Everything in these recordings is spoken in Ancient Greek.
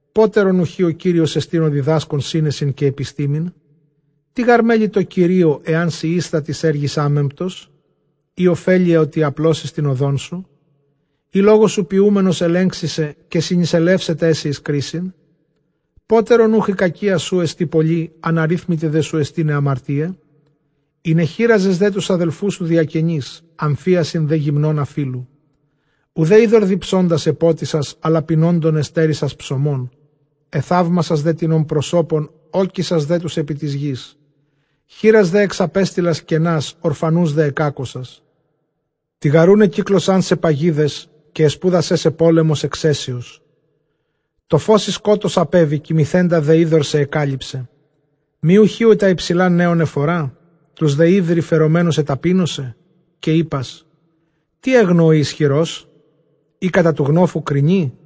Πότερον οὐχὶ ὁ Κύριός ἐστιν ὁ διδάσκων σύνεσιν καὶ ἐπιστήμην; Τί γὰρ μέλει τῷ Κυρίῳ, ἐὰν σὺ ἦσθα τοῖς ἔργοις ἄμεμπτος; ἢ ὠφέλεια, ὅτι ἀπλώσῃς τὴν ὁδόν σου; Ἢ λόγον σου ποιοῦμενος ἐλέγξεις, καὶ συνεισελεύσεταί σοι εἰς κρίσιν; Πότερον οὐχ ἡ κακία σου ἐστὶ πολλὴ, ἀναρίθμητοι δέ σου εἰσὶν αἱ ἁμαρτίαι; Ἠνεχύραζες δὲ τοὺς ἀδελφούς σου διακενῆς, ἀμφίασιν δὲ γυμνῶν ἀφείλου. Οὐδὲ ὕδωρ διψῶντας ἐπότισας, ἀλλὰ πεινώντων ἐστέρησας ψωμόν· Ἐθαύμασας δέ τινων πρόσωπον, ᾤκισας δὲ τοὺς ἐπὶ τῆς γῆς. Χήρας δὲ ἐξαπέστειλας κενὰς, ὀρφανοὺς δὲ ἐκάκωσας. Τοιγαροῦν ἐκύκλωσάν σε παγίδες, καὶ ἐσπούδασέ σε πόλεμος ἐξαίσιος. Τὸ φῶς σοι σκότος ἀπέβη, κοιμηθέντα δὲ ὕδωρ σε ἐκάλυψε. Μὴ οὐχὶ ὁ τὰ ὑψηλὰ ναίων ἐφορᾷ; τοὺς δὲ ὕβρει φερομένους ἐταπείνωσε; Καὶ εἶπας, τί ἔγνω ὁ ἰσχυρός; ἢ κατὰ τοῦ γνόφου κρίνει;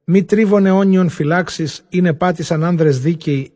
Μὴ τρίβον αἰώνιον φυλάξεις, ἣν ἐπάτησαν ἄνδρες δίκαιοι,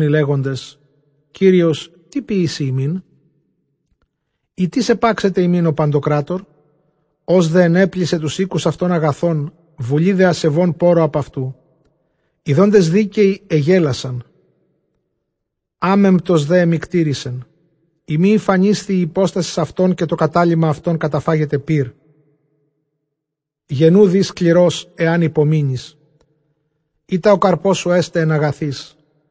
οἱ λέγοντες, Κύριος τί ποιήσει ἡμῖν; ἢ τί ἐπάξεται ἡμῖν ὁ παντοκράτωρ; Ὃς δὲ ἐνέπλησε τοὺς οἴκους αὐτῶν ἀγαθῶν, βουλὴ δὲ ἀσεβῶν πόῤῥω ἀπʼ αὐτοῦ. Ἰδόντες δίκαιοι ἐγέλασαν, ἄμεμπτος δὲ ἐμυκτήρισεν. Εἰ μὴ ἠφανίσθη ἡ ὑπόστασις αὐτῶν, καὶ τὸ κατάλειμμα αὐτῶν καταφάγεται πῦρ. Γενοῦ δὴ σκληρὸς, ἐὰν ὑπομείνῃς, εἶτα ὁ καρπός σου ἔσται ἐν ἀγαθοῖς.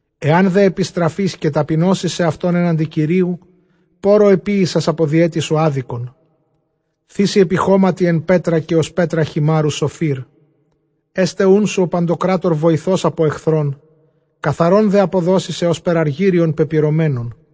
Ἐὰν δὲ ἐπιστραφῇς καὶ ταπεινώσῃς σεαυτὸν ἔναντι Κυρίου, πόῤῥω ἐποίησας ἀπὸ διαίτης σου ἄδικον. Θήσῃ ἐπὶ χώματι ἐν πέτρᾳ, καὶ ὡς πέτρα χειμάῤῥου Σωφίρ. Ἔσται οὖν σου ὁ παντοκράτωρ βοηθὸς ἀπὸ ἐχθρῶν, καθαρὸν δὲ ἀποδώσει σε ὥσπερ ἀργύριον πεπυρωμένον.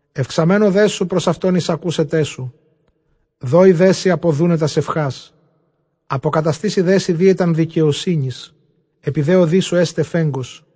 Εὐξαμένου δέ σου πρὸς αὐτὸν εἰσακούσεταί σου· δώσει δέ σοι ἀποδοῦναι τὰς εὐχάς. Ἀποκαταστήσει δέ σοι δίαιταν δικαιοσύνης, ἐπὶ δὲ ὁδοῖς σου ἔσται φέγγος·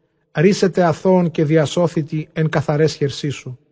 Ῥύσεται ἀθῶον, καὶ διασώθητι ἐν καθαραῖς χερσί σου.